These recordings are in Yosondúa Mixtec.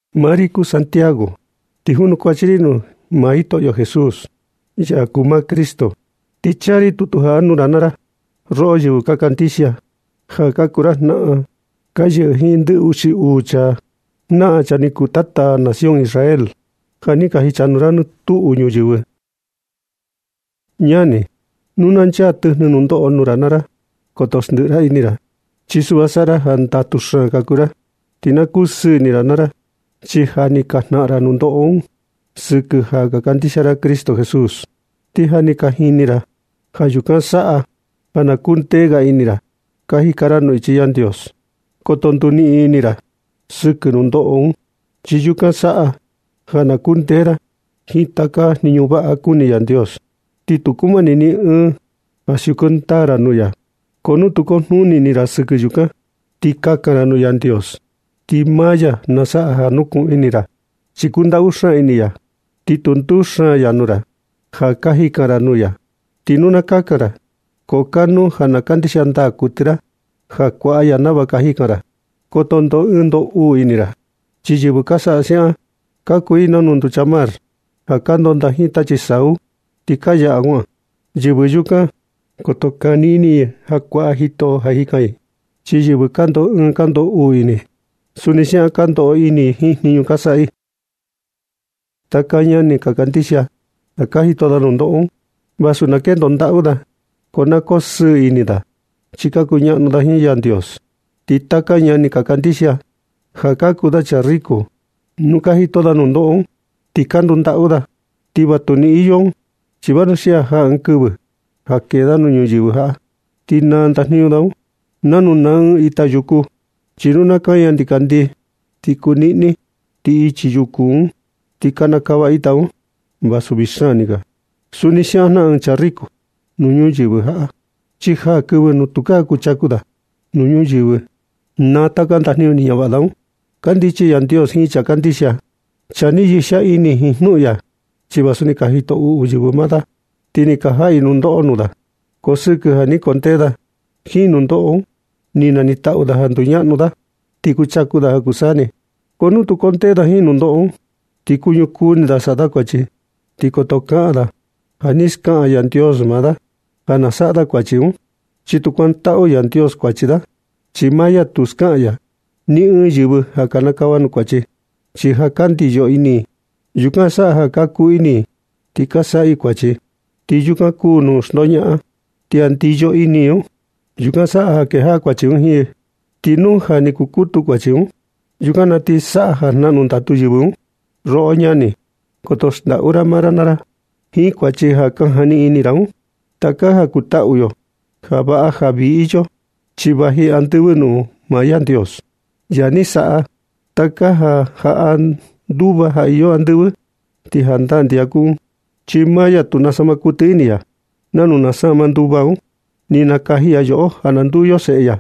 Maa ri kuu Santiago, ti junukuach ri nuu Jitoꞌo Jesús, ya kuu maa Cristo. Ti chaa ri tutu jaꞌa nuu ra naa ra, roꞌo yɨvɨ ka kandixia, ja ka kuu ra jnaꞌan ka yɨꞌɨ jiin ndɨ uxi uu janaꞌan chaa ni kuu tata nación Israel, ja ni ka jichanuu ra nɨ tuꞌu ñuyɨvɨ. Ñani, nu na chaa tɨjnɨ nuu nundoꞌo nuu ra naa ra, koto xndiꞌi ini ra. Chi suꞌva saꞌa ra ja ndatu xaan ka kuu ra, ti na kusɨɨ ini ra naa ra, chi ja ni ka jnaꞌan ra nundoꞌo sɨkɨ ja ka kandixia ra Cristo Jesús, ti ja ni ka jini ra ja yukan saꞌa ja ka kundee ga ini ra ka jika ra nuu ichi Yandios. Koto nduniꞌin ini ra sɨkɨ nundoꞌo un, chi yukan saꞌa ja na kundee ra jiin taka jniñu vaꞌa ja kuni Yandios, ti tu kumani ni ɨɨn ja siuku ndaa ra nuu ya. Ko nu tu kujnuni ini ra sɨkɨ yukan, ti kakan ra nuu Yandios, ti maa ya na saꞌa ja na nukuꞌun ini ra. Chi kundaꞌu xaan ini ya, ti tu nduxaan ya nuu ra ja ka jikan ra nuu ya. Ti nu na kakan ra, ko kanuu ja na kandixia ndaa kuɨtɨ ra ja kuaꞌa ya nava jikan ra, ti koto ndoꞌo ɨɨn ndoꞌo uu ini ra. Chi yɨvɨ ka saꞌa siaꞌan, ka kuu i nanu nducha mar ja ka ndondaa jiin tachi sau, ti ka yaꞌa kuaꞌan. Yɨvɨ yukan koto kani ini i ja kuaꞌa Jitoꞌo ja jikan i. Chi yɨvɨ ja ka ndoꞌo ɨɨn ka ndoꞌo uu ini i, suni siaꞌan ka ndoꞌo ini i jiin jniñu ka saꞌa i. Taka ñani ka kandixia ja ka jito da nundoꞌo, vasu na kendo ndaꞌu da, ko na koo sɨɨ ini da chi ka kuñaꞌnu da jiin Yandios. Ti taka ñani ka kandixia ja ka kuu da chaa riku, nu ka jito da nundoꞌo ti ka ndundaꞌu da, ti vatuni iyo un, chi vanuxia jaa ɨɨn kɨvɨ ja kee da nuu ñuyɨvɨ jaꞌa, ti naa ndajniñu da un nanu naa ɨɨn ita yuku. Chi nu na kaña ndikandii, ti kuniꞌni, ti ichi yuku un, ti kanakava ita un, vasu vii xaan ni kaa. Suni siaꞌan jnaꞌan ɨɨn chaa riku nuu ñuyɨvɨ jaꞌa, chi jaa kɨvɨ nuu tukaa kuchaku da nuu ñuyɨvɨ, ti naa taka ndajniñu ni ñavaꞌa da un. Kandichi Yandios jiin chaa kandixia, chaa ni yixia ini jiin jnuꞌun ya, chi vasu ni ka jito uꞌu yɨvɨ maa da, ti ni ka jaꞌa i nundoꞌo nuu da. Ko sɨkɨ ja ni kundee da jiin nundoꞌo un, ti naniꞌin taꞌu da ja nduñaꞌnu da, ti kuchaku da ja kuu saa ni. Ko nu tu kundee da jiin nundoꞌo un, ti kuñukuu ini da ja saꞌa da kuachi, ti koto kaꞌan da ja ni skaꞌan Yandios maa da ja na saꞌa da kuachi un. Chi tu kuantaꞌu Yandios kuachi da. Chi maa ya tu skaꞌan ya ni ɨɨn yɨvɨ ja na kinikava i nuu kuachi. Chi ja ka ndiyo ini i, yukan saꞌa ja ka kuu ini i ti ka saꞌa i kuachi. Ti yukan kuu jnuꞌun xndoñaꞌan. Ti ja ndiyo ini i un, yukan saꞌa ja kejaꞌa kuachi un jiin yɨ. Ti nu ja ni kukutu kuachi un, yukan na ti saꞌa ja jnaꞌnu ndatu yɨvɨ un. Roꞌo ñani, koto xndaꞌu ra maa ra naa ra jiin kuachi ja ka jani ini ra un. Taka ja kutaꞌu yo, ja vaꞌa ja vii iyo, chi vaji andɨvɨ nuu maa Yandios, ya ni saꞌa taka ja jaꞌa nduva ja ka iyo andɨvɨ. Ti jandaa ndixia kuu un, chi maa ya tu nasama kuɨtɨ ini ya nanu nasama nduva un. Ni nakaji ya yoꞌo ja na nduu yo seꞌe ya,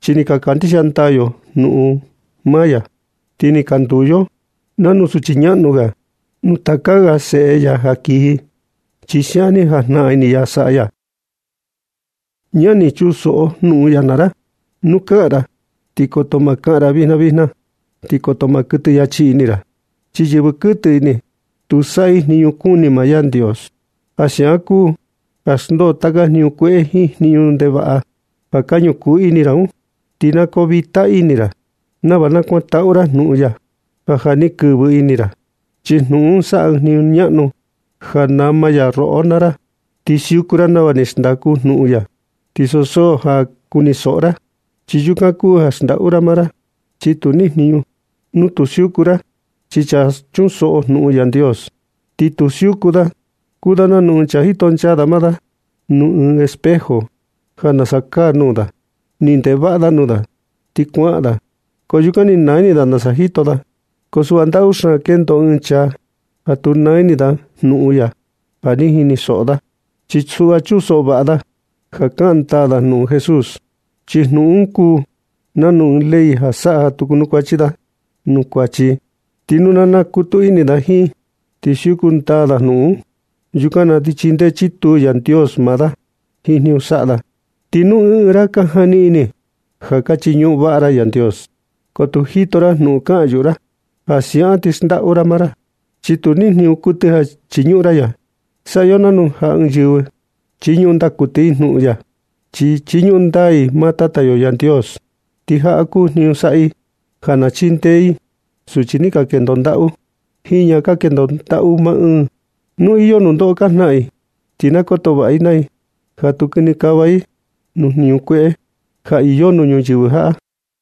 chi ni ka kandixia ndaa yo jnuꞌun ndaa ya. Ti ni ka nduu yo nanu suchi ñaꞌnu ga nuu taka ga seꞌe ya ja kiji, chi siaꞌan ni jajnaꞌan ini ya ja saꞌa ya. Ñani, chunsoꞌo jnuꞌun ya naa ra. Nu kaꞌan ra, ti koto ma kaꞌan ra vijna vijna, ni koto ma kuɨtɨ yachi ini ra. Chi yɨvɨ kuɨtɨ ini, tu saꞌa i jniñu kuni maa Yandios. Ja siaꞌan kuu ja xndoo taka jniñu kueꞌe jiin jniñu ndevaꞌa ja ka ñukuu ini ra un. Ti na koo vita ini ra nava na kuantaꞌu ra jnuꞌun ya ja ja ni kɨvɨ ini ra. Chi jnuꞌun un saꞌa ɨɨn jniñu ñaꞌnu ja nama ya roꞌo naa ra. Ti siuku ra nava xndaku jnuꞌun ya, ti ansu so ja kunisoꞌo ra, chi yukan kuu ja xndaꞌu ra maa ra, chi tu niꞌin jniñu, nu tu siuku ra. Chi chaa chunsoꞌo jnuꞌun Yandios, ti tu siuku da, kuu da nanu ɨɨn chaa jitonchaa da maa da nuu ɨɨn espejo ja nasa kaa nuu da. Ni ndeꞌe vaꞌa da nuu da, ti kuaꞌan da, ko yukan ti ni naa ni ini da nasa jito da. Ko suꞌva, ndatu xaan kendo ɨɨn chaa ja tu naa ini da jnuꞌun ya ja ni jinisoꞌo da, chi suꞌva chunsoꞌo vaꞌa da ja kaꞌan ndaa jnuꞌun Jesús. Chi jnuꞌun un kuu nanu ɨɨn ley ja saꞌa ja tukaa kunukuachi da nuu kuachi. Ti nu na nakutu ini da jiin, ti siuku ndaa da jnuꞌun un, yukan na ti chindee chituu Yandios maa da jiin jniñu saꞌa da. Ti nu ɨɨn ɨɨn ra ka jani ini ja ka chiñuꞌun vaꞌa ra Yandios, ko tu jito ra jnuꞌun kaꞌan yuꞌu ra, ja siaꞌan ti xndaꞌu ra maa ra, chi tu nijniñu kuɨtɨ ja chiñuꞌun ra ya. Saꞌa yo nanu ja nu ɨɨn yɨvɨ chiñuꞌun ndaa kuɨtɨ i jnuꞌun ya, ti chiñuꞌun ndaa i maa Tata yo Yandios, ti jaꞌa kuu jniñu saꞌa i: Ja na chindee i suchi ni ka kendo ndaꞌu, jiin ñaꞌan ka kendo ndaꞌu maa ɨɨn, nu iyo nundoꞌo ka jnaꞌan i. Ti na koto vaꞌa i maa i ja tu kinikava i nuu jniñu kueꞌe ja iyo nuu ñuyɨvɨ jaꞌa.